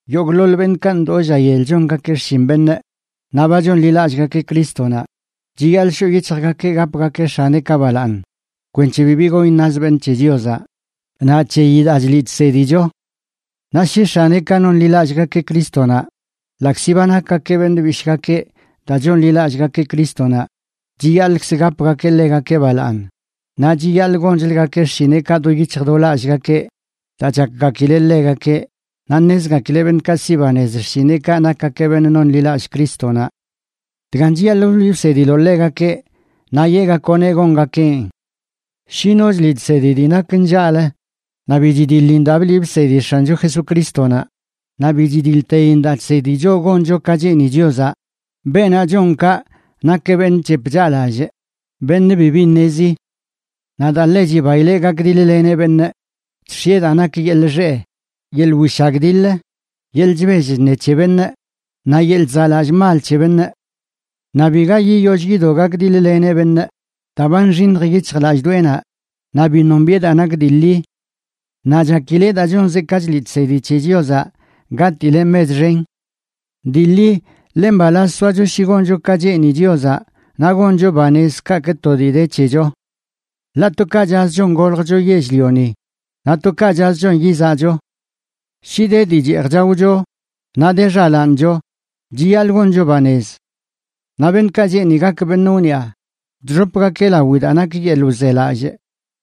Yogꞌḻoḻ beṉꞌkaꞌ ndoo lla yel chongakeꞌ xshin beṉꞌ naꞌ ba chonḻilallꞌgakeꞌ Crístonaꞌ, chiyaḻꞌ shoꞌ yic̱hjgakeꞌ gapgakeꞌ x̱aneꞌkaꞌ balaaṉ kwenc̱he bibi gon iṉaz beṉꞌ c̱he Chiozaꞌ naꞌ c̱heyi daa chliꞌ chsedicho. Naꞌ shi x̱aneꞌkaꞌ nonḻillꞌgakeꞌ Crístonaꞌ, ḻaꞌkzi ba nakgakeꞌ beṉꞌ bishꞌgakeꞌ daa chonḻilallꞌgakeꞌ Crístonaꞌ, chiyaḻꞌkz gapgakeꞌ ḻegakeꞌ balaaṉ, naꞌ chiyaḻꞌ gonchləgakeꞌ xshineꞌkaꞌ do yic̱hj do lallꞌgakeꞌ daa chakgakileꞌ ḻegakeꞌ naꞌ ṉezgakileꞌ beṉꞌkaꞌ siꞌ banez xshineꞌkaꞌ nakgakeꞌ beṉꞌ nonḻilallꞌ Crístonaꞌ. Dgan chiyaḻꞌ wliꞌ wsediloꞌ ḻegakeꞌ naꞌ yeꞌgakoꞌneꞌ gongakeꞌn. Shi no chliꞌ chsedi dii nak nllaꞌlə naꞌ bi chidiḻin daa bliꞌ bsedi X̱ancho Jesucrístonaꞌ, naꞌ bi chidiḻtein daa chsedi choꞌ goncho ka cheeni Chiozaꞌ, beenaꞌ chon kaꞌ nakeꞌ beṉꞌ chep chaꞌlallꞌ, beṉꞌ bibi ṉezi. Naꞌ daa ḻe chibaileꞌ gakdiḻ-leneꞌ beṉꞌ, chx̱ieꞌ daa nak yeḻꞌ xeꞌ, yeḻꞌ wishagdiḻ, yeḻꞌ chbell chṉe c̱he beṉꞌ, naꞌ yeḻꞌ chzaꞌlallꞌ mal c̱he beṉꞌ. Naꞌ biga yiyoll yido gakdiḻ-leneꞌ beṉꞌ daa ba nxiṉj yic̱hlallꞌdoꞌenaꞌ, naꞌ bi nombiꞌe daa nak dii ḻi. Naꞌ chakileꞌ daa chonzeꞌ ka chliꞌ chsedi c̱he Chiozaꞌ gatileꞌ mech xen. Dii ḻi, ḻe mbalaz soacho shi goncho ka cheeni Chiozaꞌ naꞌ goncho banez kaꞌkꞌ to dii de c̱hecho. Ḻaꞌ to ka chaꞌzchon goljcho yell-lioni, naꞌ to ka chaꞌzchon yizaꞌcho. Shi de dii cheej chaocho naꞌ de xalaancho, chiyaḻꞌ goncho banez. Naꞌ beṉꞌkaꞌ cheeni gak beṉꞌ wniꞌa, chxopgakeꞌ lawi daa nak yeḻꞌ wzelallꞌ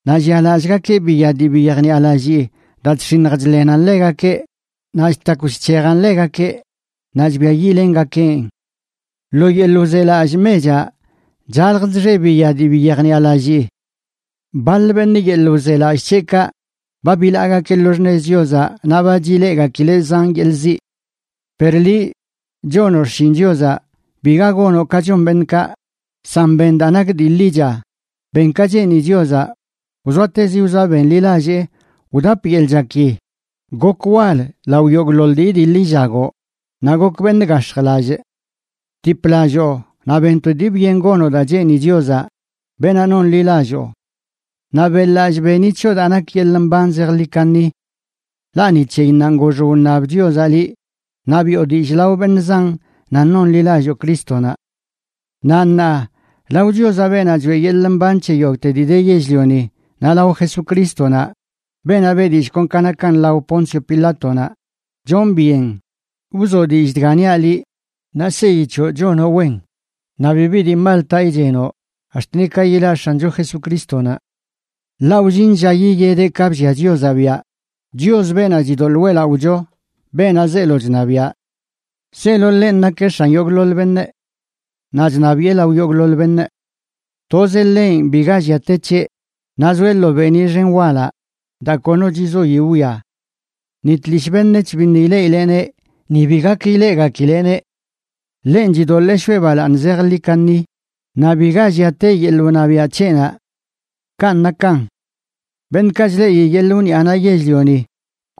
naꞌ llialallꞌgakeꞌ biya dii bi yejniꞌalallii daa chx̱iṉj chḻenan ḻegakeꞌ, naꞌ chtakw chc̱hejan ḻegakeꞌ naꞌ chbiayiꞌlengakeꞌn. Lo yeḻꞌ wzelallꞌ mechaꞌ chalj chxe biya dii bi yejniꞌalallii. Baḻ beṉꞌ, yeḻꞌ wzelallꞌ c̱heꞌkaꞌ, ba bilaagakeꞌ lo xṉez Chiozaꞌ naꞌ ba chileꞌgakileꞌ zan yeḻꞌ ziꞌ. Per liꞌ chonoꞌ xshin Chiozaꞌ, biga gonoꞌ ka chon beṉꞌkaꞌ, san ben daa nak dii ḻicha, ben ka cheeni Chiozaꞌ, wzoatezi wzoa benḻilallee, wdap yeḻꞌ chaki, gok wal lao yogꞌḻoḻ dii idiḻ illagoꞌ, naꞌ gok beṉꞌ gax̱jlallꞌ. Btiplalloo naꞌ ben to dii byen gonoꞌ daa cheeni Chiozaꞌ, beenaꞌ nonḻilalloo. Naꞌ beꞌḻ-lallꞌ beni c̱hoꞌ daa nak yeḻꞌ mban zejḻi kaṉi. Ḻaꞌ ni c̱heyinnanꞌ gox wṉab Chiozaꞌ liꞌ naꞌ biꞌo dillꞌ lao beṉꞌ zan nan nonḻilalloo Crístonaꞌ. Naꞌ ṉaa, lao Chiozaꞌ, beenaꞌ choeꞌ yeḻꞌ mban c̱he yogꞌte dii de yell-lioni, naꞌ lao Jesucrístonaꞌ, beenaꞌ beꞌ dillꞌ kon ka nakan lao Poncio Pilátonaꞌ, chonꞌ byen wzoꞌ dillꞌ dga niaꞌ liꞌ, naꞌ seyi c̱hoꞌ chonoꞌ wen naꞌ bibi dii mal taꞌ ichenoꞌ ax̱t ni ka yilaꞌ X̱ancho Jesucrístonaꞌ. Ḻaꞌ wllin lla yiyedeꞌ ka bllia Chiozaꞌ biaꞌ, Chios, beenaꞌ chidoḻꞌ weꞌlaꞌocho, beenaꞌ zeelo chṉabiaꞌ. Zeelo ḻenꞌ nakeꞌ X̱an yogꞌḻoḻ beṉꞌ, naꞌ chṉabiꞌe lao yogꞌḻoḻ beṉꞌ. Tozeꞌ ḻenꞌ biga llia te c̱heꞌ, naꞌ zoeꞌ lo beeniꞌ xen walaꞌ daa kono chzoi wwia. Ni tlishꞌ beṉec̱h biṉꞌ ileꞌileꞌneꞌ ni bi gak ileꞌgakileꞌneꞌ. Ḻenꞌ chidoḻee shoꞌe balaaṉ zejḻi kaṉi naꞌ biga llia te yeḻꞌ wṉabiaꞌ c̱heꞌnaꞌ. Kanꞌ nakan. Beṉꞌkaꞌ chleꞌi yeḻꞌ wniꞌanaꞌ yell-lioni,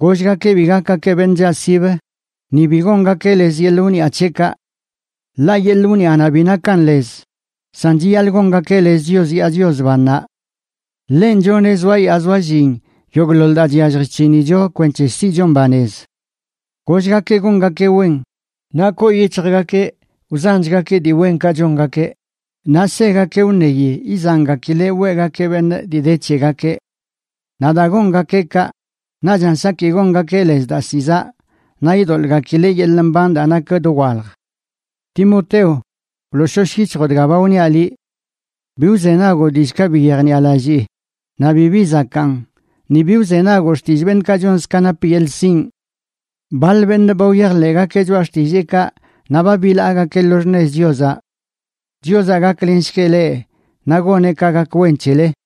gollgakeꞌ bi gakgakeꞌ beṉꞌ chaꞌsibə, ni bi gongakeꞌ lez yeḻꞌ wniꞌa c̱heꞌkaꞌ. Ḻaꞌ yeḻꞌ wniꞌanaꞌ bi nakan lez. San chiyaḻꞌ gongakeꞌ lez Chios yaa Chios bannaꞌ. Ḻenꞌ choneꞌ zoayaa zoallin yogꞌḻoḻ daa chyallj chc̱hinicho kwenc̱he siꞌchon banez. Gollgakeꞌ gongakeꞌ wen, naꞌ koo yic̱hjgakeꞌ wzanchgakeꞌ dii wenkaꞌ chongakeꞌ, naꞌ segakeꞌ wṉeyi izangakileꞌ weꞌgakeꞌ beṉꞌ dii de c̱hegakeꞌ. Naꞌ daa gongakeꞌ kaꞌ, naꞌchan saki gongakeꞌ lez daa ziꞌ zaꞌ, naꞌ idoḻꞌgakileꞌ yeḻꞌ mban daa nak dowalj. Timoteo, wlooshosh yic̱hjoꞌ dga ba wniaꞌ liꞌ. Bi wzenagoꞌ dillꞌkaꞌ bi yejniꞌalallii naꞌ bibi zakaan, ni bi wzenagoꞌ xtillꞌ beṉꞌkaꞌ chonzə ka nap yeḻꞌ sinꞌ. Baḻ beṉꞌ ba wyajḻeꞌgakeꞌ choꞌa xtilleekaꞌ naꞌ ba bilaagakeꞌ lo xṉez Chiozaꞌ. Chiozaꞌ gaklenshgueꞌ leꞌ naꞌ goneꞌ ka gak wen c̱hele.